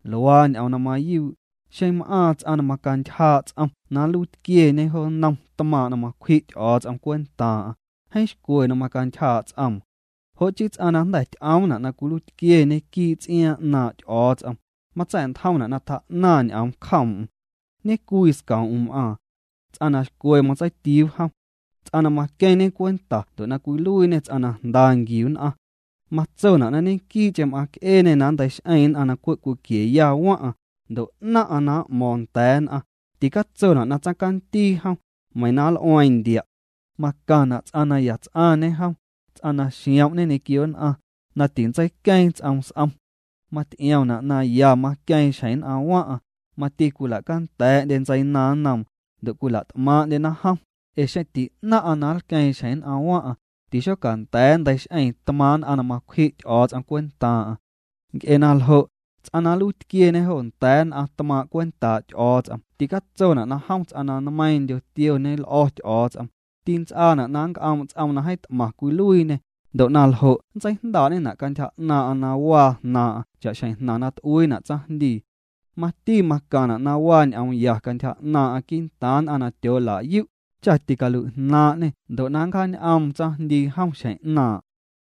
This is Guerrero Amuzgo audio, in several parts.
Luaa ñ'oom na mayuu': xeⁿ m'aaⁿ ts'aⁿ na macantyjaa' ts'oom na nluiitquieñê jo nnom tmaaⁿ' na macwji' Ty'o̱o̱ts'om cwentaaⁿ'aⁿ, jeeⁿ xcwe na macantyjaa' ts'oom. Jo' chii ts'aⁿ na jnda̱ ty'oomna' na cwiluiitquieñe quii' ts'iaaⁿ 'naaⁿ' Ty'o̱o̱ts'om, matsa̱'ntjomna' na tjaa'naⁿ ñ'oom cjoom'm. Ñecwii scoom'm m'aaⁿ. Ts'aⁿ na xcwe matseitiuu jom. Ts'aⁿ na maqueⁿñe cwenta ndo' na cwiluiiñê ts'aⁿ na jnda nquiu nn'aⁿ. Matsona' na ñequii'cheⁿ m'aaⁿc'eeñê na nnteix'eeⁿ nn'aⁿ na cwe' cwiquieya waⁿ'aⁿ, ndo' 'naⁿ'aⁿ na m'mo̱o̱ⁿ nda̱a̱ nn'aⁿ, ticatsona' na tsaⁿcandii jom, meiⁿ na nl'ueeⁿ ndia'. Macaⁿna' ts'aⁿ na yats'aⁿñe jom, ts'aⁿ na xiom'ñe ñequio nn'aⁿ, na tintseiqueeⁿ ts'oom s'om. Maty'iomna' na ya maqueeⁿ xjeⁿ nn'aⁿ waⁿ'aⁿ, mati cwila'canda̱a̱'ndye ntseinaaⁿ nnoom, ndo' cwila't'maaⁿ'ndyena jom, ee xeⁿ ti'naⁿ'aⁿ na nlqueeⁿxjeⁿ nn'aⁿ waⁿ'aⁿ, tixocanda̱a̱ nnteix'eeⁿ tmaaⁿ' nn'aⁿ na macwji' Ty'o̱o̱ts'om cwentaaⁿ'aⁿ. Nc'e na ljo', ts'aⁿ na nluiitquieñe jo nda̱a̱ nn'aⁿ tmaaⁿ' cwentaa' Ty'o̱o̱ts'om ticatsona' na jom ts'aⁿ na nmeiiⁿndyo tioñe l'o̱ Ty'o̱o̱ts'om, tints'aana' na nnc'oom' ts'oom na jeeⁿ t'maⁿ cwiluiiñê, ndo' na ljo' ntseijndaa'ñena' cantyja 'naaⁿ'aⁿ na waa jnaaⁿ'aⁿ cha'xjeⁿ jnaⁿ na t'uiina' tsaⁿjndii. Mati macaⁿna' na waa ñ'oom ya cantyja 'naaⁿ'aⁿ quii'ntaaⁿ nn'aⁿ na tyoola'yu', cha ticalui'jnaaⁿ'ñê ndo' na ncjaañ'oom tsaⁿjndii jom xjeⁿ 'naaⁿ'.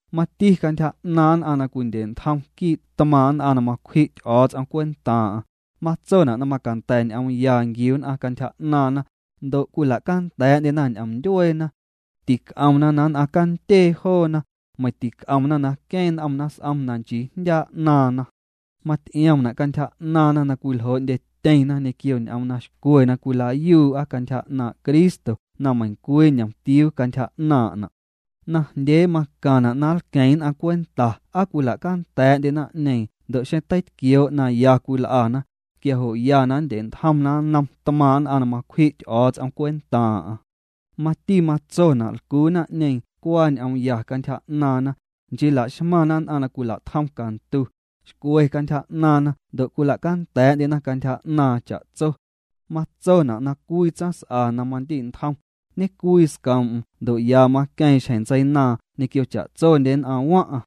Mati cantyja 'naaⁿ nn'aⁿ na cwindye'ntjom quii' tmaaⁿ' nn'aⁿ na macwji' Ty'o̱o̱ts'om cwentaaⁿ'aⁿ, matsona' na macanda̱ ñ'oom ya nquiu nn'aⁿ cantyja 'naaⁿna, ndo' cwila'canda̱a̱'ndyena ñ'om ndyueena. Tinc'omna na nn'aⁿ candyee joona, meiⁿ tinc'omna na queeⁿ n'omna s'om na nchii jndyaa' 'naaⁿna. Maty'iomna' cantyja 'naaⁿna na cwiljoo'ndyetyeⁿna ñequio ñ'oom na xcwe na cwila'yuu'a cantyja 'naaⁿ' Cristo na meiⁿcwii ñomtiuu cantyja 'naaⁿ'na'. Najndyee macaⁿna' na nlqueⁿ nn'aⁿ cwenta aa cwila'canda̱a̱'ndye naⁿ'ñeeⁿ ndo' xeⁿ teitquioo' na ya cwil'ana, quia jo' ya nndye'ntjomna nnom tmaaⁿ' nn'aⁿ na macwji' Ty'o̱o̱ts'om cwentaaⁿ'aⁿ. Mati matsona' lcuu naⁿ'ñeeⁿ cuaa ñ'oom ya cantyja 'naaⁿna, nchii la'xmaⁿna nn'aⁿ na cwila'tjom cantu, xcwe cantyja 'naaⁿna ndo' cwila'canda̱a̱'ndyena cantyja 'naaⁿ cha'tso. Matsona' na cwii tsaⁿs'a na mandi'ntjom, ñecwii scoom'm ndo' ya maqueeⁿ xjeⁿ ntseinaaⁿ ñequio cha'tsondye nn'aⁿ waⁿ'aⁿ.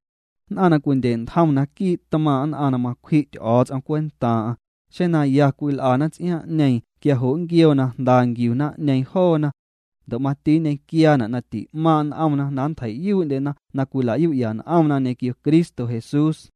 Nn'aⁿ na cwindye'ntjom naquii' tmaaⁿ' nn'aⁿ na macwji' Ty'o̱o̱ts'om cwentaaⁿ'aⁿ, xeⁿ na ya cwil'ana ts'iaaⁿ'ñeeⁿ quia jo' nnquioo na jnda nquiu naⁿ'ñeeⁿ joona. Ndo' mati nñequiaana' na ti'maaⁿ' n'omna na nntjei'yuu'ndyena na cwila'yu'ya n'omna ñequio Cristo Jesús.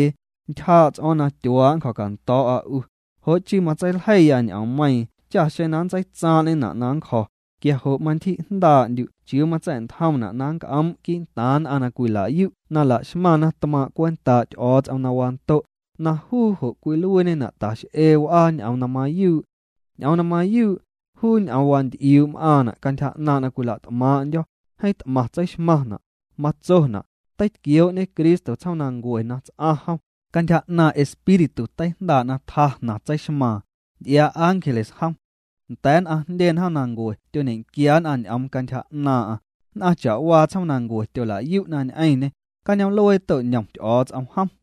Ntyjaa' ts'o̱o̱ⁿ na tyuaa' nncjo̱cando̱o̱'a 'u, jo' chii matseiljeiya ñ'oommeiiⁿ cha xeⁿ na nntseitsaaⁿ'ñena' na nncjo̱, quia jo' mantyji'jndaa'ndyu' chiuu matsa̱'ntjomna' na nnc'oom' quii'ntaaⁿ nn'aⁿ na cwila'yu' na la'xmaⁿna tmaaⁿ' cwentaa' Ty'o̱o̱ts'om na wando', na juu jo' cwiluiiñena' tax'ee w'aa ñ'oom na mayuu'. Ñ'oom na mayuu', juu ñ'oom wanty'iuu' m'aaⁿna' cantyja 'naaⁿ' na cwila't'maaⁿ'ndyo̱, jeeⁿ t'maⁿ tseixmaⁿna', matsona': Teitquioo'ñe Cristo tsjoomnancue na ts'aⁿ jom, cantyja 'naaⁿ' Espíritu teijndaa' na tjaa jnaⁿ tseixmaaⁿ, nty'iaa ángeles jom. Nda̱a̱ nn'aⁿ jndye njoomnancue tyoñequia nn'aⁿ ñ'oom cantyja 'naaⁿ'aⁿ, nn'aⁿ cha'waa tsjoomnancue tyola'yu'na ñ'eⁿñê, cañoom'luee to'ñom Ty'o̱o̱ts'om jom.